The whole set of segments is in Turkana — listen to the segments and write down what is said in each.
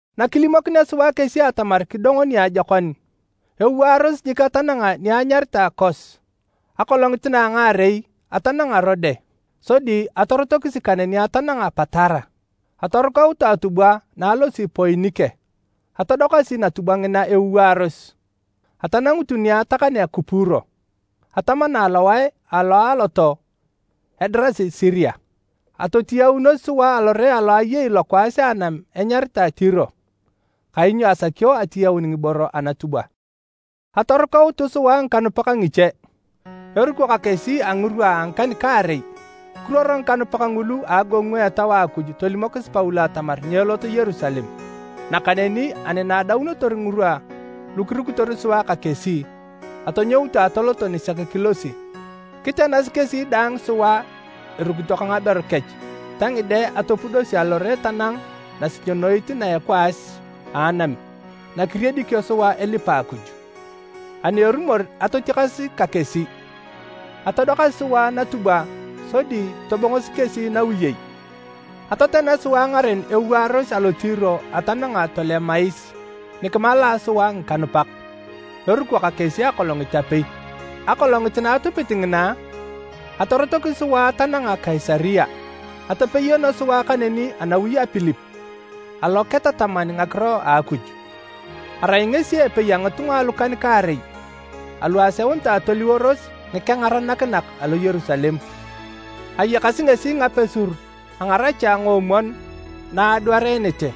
Nakilimokinea sua kesi atamar kidongo niajokon, ewaaros jik atananga ni anyaritae Kos. Akolongit na a ngaarei, atananga Rode sodi atorotokisi kaneni atananga Patara. Atorukautu atubwa na alosi Poinike. Atodokasi natubwa ngina ewaaros. Atanangutu ni atakanea Kupuro, atamana alowae alo a atoo edirasi Siria. Atotiyaunos sua alore alo ayei lokwaas a anam enyaritae Tiro kainyo asakio atiyaun ngiboro anatubwa. Atorukautu sua ngikanupak ngiche, eruko ka kesi a ngirwa a ngikan-kaarei. Kiruoro ngikanupak ngulu a agogongu a Etau a Akuj tolimokis Paulo atamar nyeelot Yerusalem. Nakaneni ani na adaunotor ngirwa lu kirukitor sua ka kesi, atonyoutu atoloto nisek kilosi. Kitenasi kesi daang sua erukito ka ngaberu kech ta ngide atopudosi alore tanang nasinyonoit na a ekwaas a anam na kiriedikio sua elipa Akuj. Ani erumor atotiakas ka kesi, atodokasi sua natubwa sodi tobongosi kesi nawiyei. Atotena sua ngaren ewaaros alo Tiro atananga Tolemais ni kimalaa sua ngikanupak, eruko ka kesi akolongit apei. Akolongit na atupit ngina, atorotokisi sua atananga Kaisaria. Atepeyono sua kaneni anawi a Pilip alo ketataman ngakiro a Akuj. Arai ngesi epei a ngitunga alukan-kaarei alu aseunitae toliworos ngikengaranakinak alo Yerusalem. Ayakasi ngesi ngapesur a ngaracha ngoomwon na adwareenete.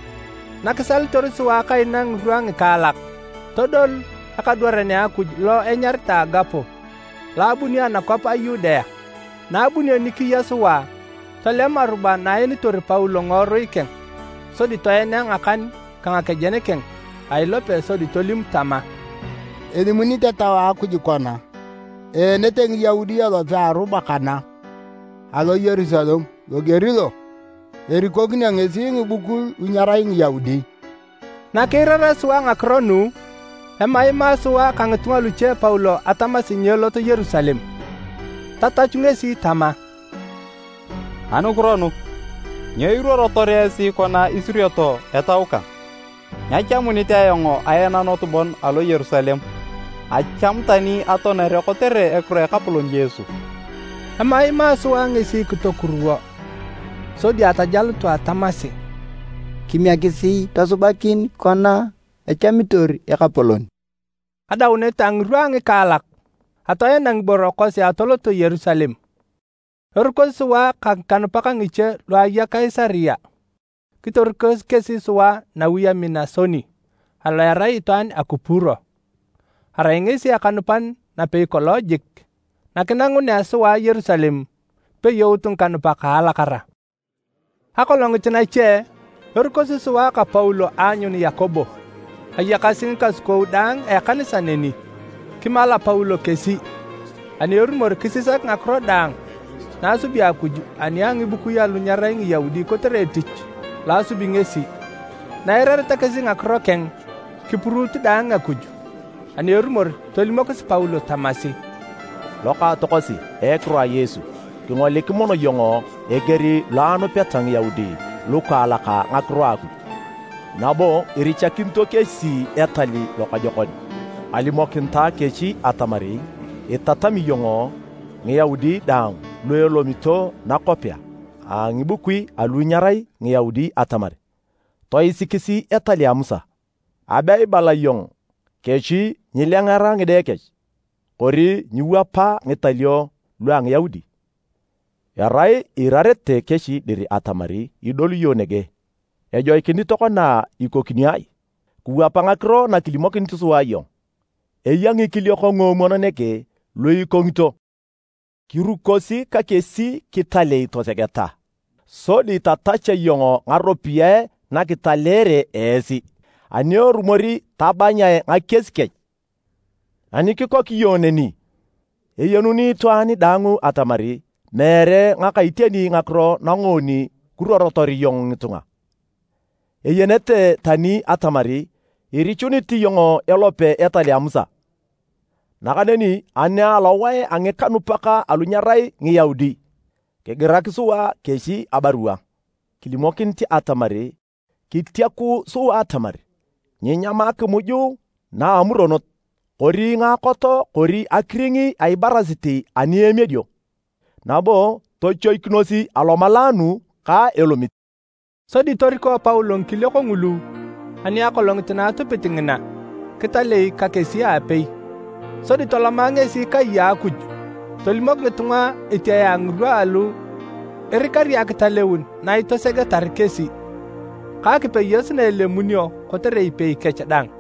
Nakisalitor sua kaina ngirwa ngikaalak, todolu ekadwaran a Akuj lo enyaritae Agabo lo abuni anakwap a Yudea. Na abunio ni kiya sua, tolem aruba na aenitor Paulo ngiworui keng sodi toenea ngakan ka ngakejen keng a ilope sodi tolim tama, “Elimunit Etau a Akuj kona, eenete Ngiyaudi elope a aruba kana alo Yerusalem loger lo. Erikokinio ngesi ngibukui lu nyerai Ngiyaudi.” Nakiirarea sua ngakiro nu, emaima sua ka ngitunga luche Paulo atamasi nyeelot Yerusalem. Tatachu ngesi tama, “Anukiro nu? Nyo iruorotor esi kona isurioto etau kang? Nyachamunit ayong aenanot bon alo Yerusalem, achamu tani atoanere kotere ekiro a Ekapolon Yesu.” Emaimaa sua ngesi kitokuruwo. Sodi atajalutu atamasi, “Kimiekisi tosubakin kona echamitor Ekapolon.” Adaunet a ngirwa a ngikaalak, atoena ngiboro kosi atoloto Yerusalem. Erukosi sua ka ngikanupak ngiche lu aya Kaisaria kiterikosi kesi sua nawi a Minasoni alo erai itwaan a Kupuro. Arai ngesi ekanupan napei kolong jik. Nakinangunea sua Yerusalem, kipeyout ngikanupak a alakara. Akolongit nache, erukosi sua ka Paulo aanyun Yakobo. Ayakasi ngikasukou daang a ekanisa neni. Kimala Paulo kesi, ani erumor kisisak ngakiro daang na asubi Akuj ani a ngibukui alu nyerai Ngiyaudi kotere etich lo asubi ngesi. Na eirareta kesi ngakiro keng, kipuruut daang Akuj. Ani erumor tolimokis Paulo tamasi, “Lokaatokosi a ekiro a Yesu, kingolik mono iyong eger lo anupeta Ngiyaudi lukaalak ngakiro a Akuj, nabo irichakinito kesi etal lokojokon. Alimokinitae kesi atamar itatami iyong Ngiyaudi daang lu elomito nakwapea a ngibukui alu nyerai Ngiyaudi atamar toisikis etal a Musa. Abe ibala iyong kesi nyiilengera ngide kech, kori nyiiwap ngitalio lua Ngiyaudi. Erai iirarete kesi dir atamar idolu iyong nege. Ejoikinit tokona ikokinio ai? Kiwap ngakiro na kilimokini sua iyong. Eya ngikiliok nguomwon nege lu ikongito. Kirukosi ka kesi kitalei tosegeta sodi tatach iyong ngaropiyae nakitaleere esi, ani erumor tabanyae ngakies kech. Ani kikok iyong neni, eyenuni itwaan daang atamar meere ngaka iteni ngakiro nangoon kiruorotor iyong ngitunga. Eyenete tani atamar irichunit iyong elope etal a Musa. Nakaneni ani alowae a ngikanupak alu nyerai Ngiyaudi, kigirak sua kesi abarua kilimokinit atamar kitiaku sua atamar nyeenyam akimuj na a amuronot kori ngaakot kori akiring a ibarasit ani emiedio, nabo tochoikinos alomalaanu ka elomit.” Sodi toriko Paulo ngikiliok ngulu ani akolongit na atupit ngina, kitalei ka kesi aapei. Sodi toloma ngesi kai a Akuj tolimok ngitunga etiae a ngirwa alu irikari akitaleun na itosegetar kesi, ka akipeyos na elemunio kotere ipei kech daang.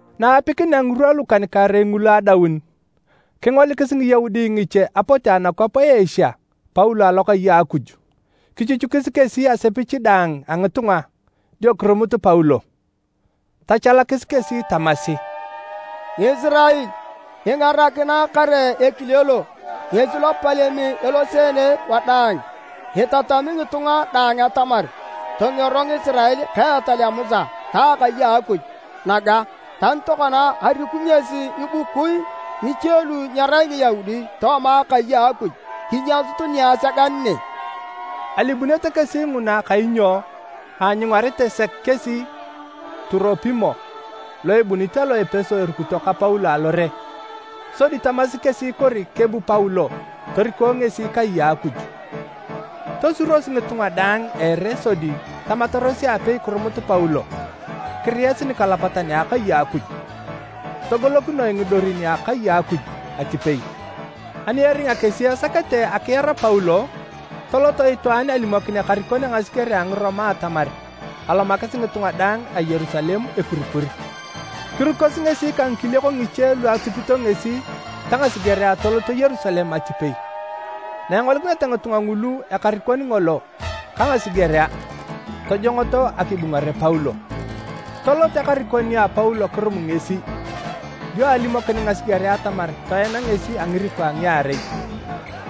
Na aapikinea ngirwa lukan-kaarei ngulu adaun, kingolikis Ngiyaudi ngiche apote anakwap a Asia Paulo alokai a Akuj. Kichuchukis kesi asepich daang a ngitunga dio kirumut Paulo. Tachalakis kesi tamasi, “Ngisirael! Kingarakinae kare! Ekile lo ngesi lopalem eloseene wadaang itatami ngitunga daang atamar tongero Ngisirael ka etal a Musa ta akai a Akuj naga. Tani tokona, ariku ngesi ngibukui ngiche lu nyerai Ngiyaudi tooma akai a Akuj kinyasut niasegan ne!” ( Alimunete kesi nguna kainyo aanyungarete sek kesi Turopimo lo ebunit alo Epeso erukito ka Paulo alore. Sodi tamasi kesi kori kebu Paulo toriko ngesi kai a Akuj.) Tosuros ngitunga daang a ere sodi tamataros aapei kirumut Paulo kiriyasi nikalapatan a akai a Akuj. Togolokinoe ngidorin a akai a Akuj atipei. Ani eringa kesi esakete akiar Paulo, tolot itwaan alimokin ekarikon a ngasigerea a Ngiroma atamar alomakis ngitunga daang a Yerusalem ekurikur. Kirukosi ngesi ka ngikarikok ngiche lu atupito ngesi ta ngasigerea toloto Yerusalem atipei. Na engolikineta ngitunga ngulu ekarikon ngolo ka ngasigerea, tojongoto akibungare Paulo. Tolot ekarikon nia Paulo kirum ngesi, dio alimokin ngasigerea atamar toena ngesi a ngiriko a ngiarei.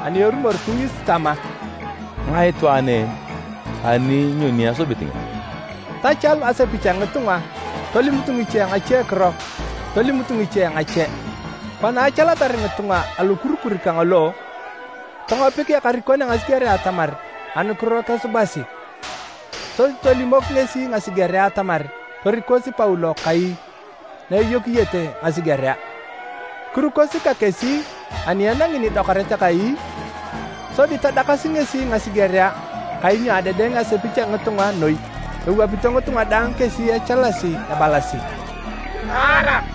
Ani erumor kingis tama, “Ngae itwaan en, ani nyoni esubit ngesi?” Tachalu asepich a ngitunga tolimut ngiche ngachekiro, tolimut ngiche ngache. Kona achalatar ngitunga alokurikur kangolo, tongopik ekarikon a ngasigerea atamar anukiro kesubasi. Sodi tolimok ngesi ngasigerea atamar torikosi Paulo kai na eyokiyete ngasigerea. Kirukosi ka kesi ani enangi nidokaret kai, sodi tadakasi ngesi ngasigerea kainyo adedeng asepich a ngitunga noi. Ewapito ngitunga daang kesi echalasi ebalasi, “Taara!”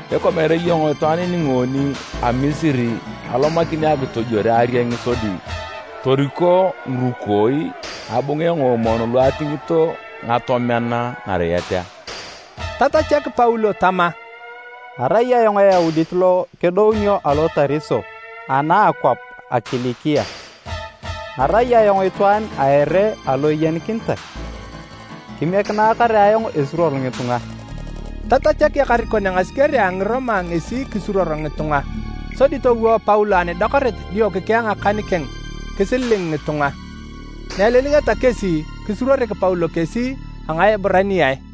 Ikwa meere iyong itwaan ni ngoon a Misiri alomakini akitojwore arieng sodi toriko ngirukooi ngabunge ngoomwon lu atingito ngatomean nariet a?” Tatachak Paulo tama, “Arai ayong Eyaudit lo kedounio alo Tariso ana a akwap a Kilikia, arai ayong itwaan a ere alo eyenikinitae. Kimiekinae kare ayong esuruor ngitunga.” Tachamak ekarikon a ngasigerea a Ngiroma ngesi akisuruor ngitunga. Sodi towo Paulo anidokaret dio kikea akan keng kisililing ngitunga. Na elilingeta kesi, kisuruorik Paulo kesi a Ngaeburaniae.